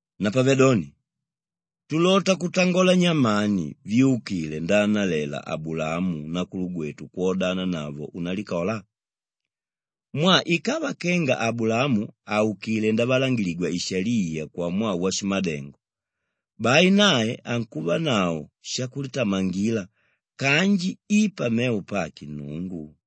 Napavedoni, tulota kutangola nyamani vyúkile ndaanalela Abulaamu nakulugwetu kwodananavo unalikola? Mwaa ikava kenga Abulaamu aukilé ndavalangiligwa ishaliya kwamwaa washimadengo, bai nae ankuvanavo shakulitamangila kanji i pamevo pake Nnungu.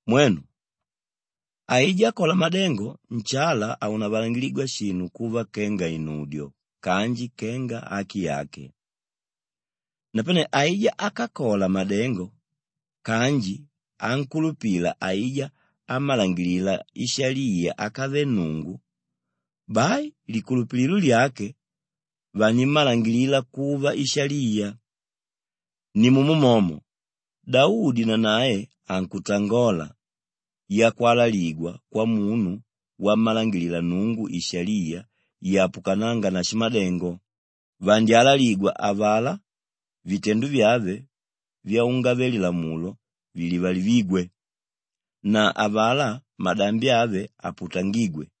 Mwenu, aijá ákola madengo nshala haunavalangiligwa shinu kuva kenga inudyo kanji kenga aki yake. Napane aijá ákakola madengo kanji ánkulupila aijá ámmalangilila ishaliya ákave Nnungu, bai likulupililo lyake vanimmalangilila kuva ishaliya. Nimumo momo Daudi nanae ankutangola yakwalaligwa kwamunu wammalangilila Nnungu ishaliya yapukanánga na shimadengo, “Vandyalaligwa avalá vitendo vyave vyaungave-lilamulo vilivalivígwe, na avalá madambi ave aputangígwe.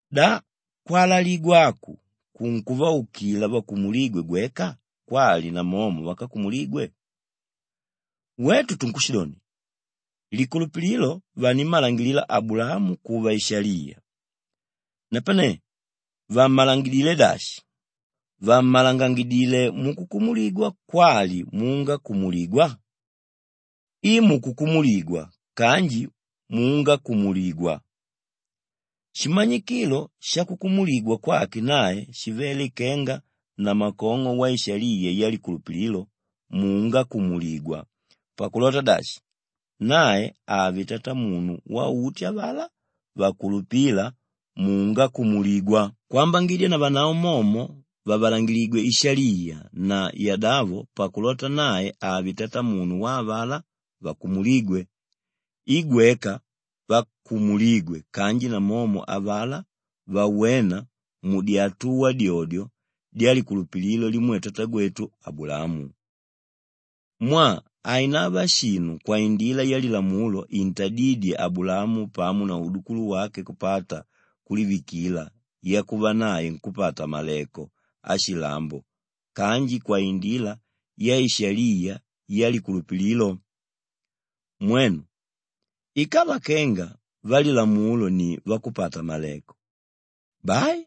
Da kwalaligwa aku kunkuvaukila vakumulígwe gweka kwali namomo vákakumuligwe? Wetu tunkushidoni, likulupililo vanimmalangilila Abulaamu kuva ishaliya. Napane vammalangilidilé dashi? Vammalangilidilé mukukumuligwa kwali muungakumuligwa? I mukukumuligwa kanji muungakumuligwa. Shimanyikilo shakukumuligwa kwake nae shivele kenga namakong'o waishaliya yalikulupililo muungakumuligwa pakulota dashi, nae ave tatamunu wauti avalá vakulupíla muungakumuligwa kwambangidya navanavo momo vavalangiligwe ishaliya na yadavo pakulota nae ave tatamunu wa avalá vakumulígwe i gweka vakumulígwe kanji namomo avalá vawéna mudyatuwa dyodyo dyalikulupililo limwe tatagwetu Abulaamu. Mwaa hainava shinu kwaindila yalilamulo intadídye Abulaamu pamo na udukulu wake kupata kulivikila yakuva nae nkúpata-maleko ashilambo kanji kwaindila yaishaliya yalikulupililo. Mwenu, ikava kenga vamulilamulo ni vakupata-maleko, bai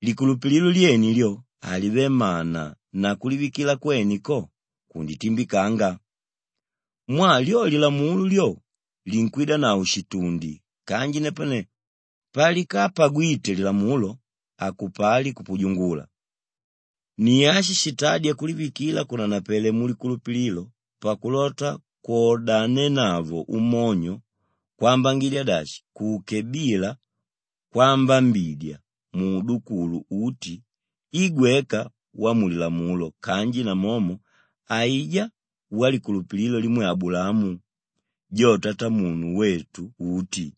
likulupililo lyene lyo, halive mana na kulivikila kwene ko, kunditimbikanga. Mwaa lyo lilamulo lyo, linkwidanavo shitundi kanji napane palikapagwite lilamulo, hakupali kupujungula. Ni ashi shitádya kulivikila kunanapele mulikulupililo pakulota kwodanenavo umonyo kwambangidya dashi kuke bila kwambambidya muudukulu uti i gweka wamulilamulo kanji namomo aijá walikulupililo limwe Abulaamu, jo tatamunu wetu uti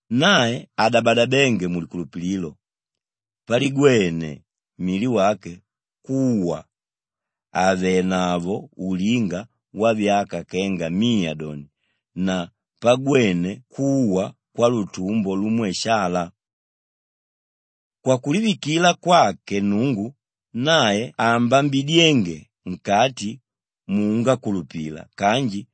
Nae hadabadabénge mulikulupililo paligwene mili wake kuwa àvenavo ulinga wavyaka kenga miya doni na pagwene kuwa kwalutumbo lumwe Shalaa. Kwakulivikila kwake Nnungu, nae hambambidyenge nkati muungakulupila kanji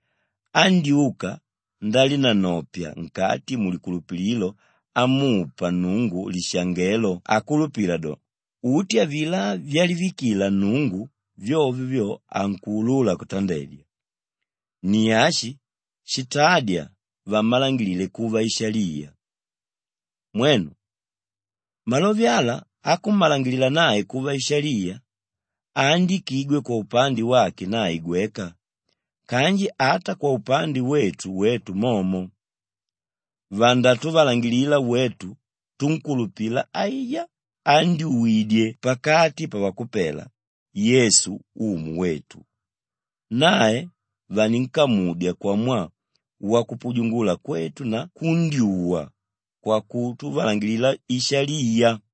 andyuka ndalinanopya nkati mulikulupililo amupa Nnungu lishangelo akulupila do, uti avilá vyalivikila Nnungu, vyovyo vyo ankuulula kutandedya. Ni ashi shitádya vammalangilile kuva ishaliya. Mwenu, malove ala akummalangilila nae kuva ishaliya haandikigwe kwaupande wake nae gweka kanji ata kwaupande wetu wetu momo. Vandatuvalangilila wetu túnkulupila aijá ándyuwidye pakati pavakupela, Yesu Umu wetu. Nae vaninkamudya kwamwaa wakupujungula kwetu na kundyuwa kwakutuvalangilila ishaliya.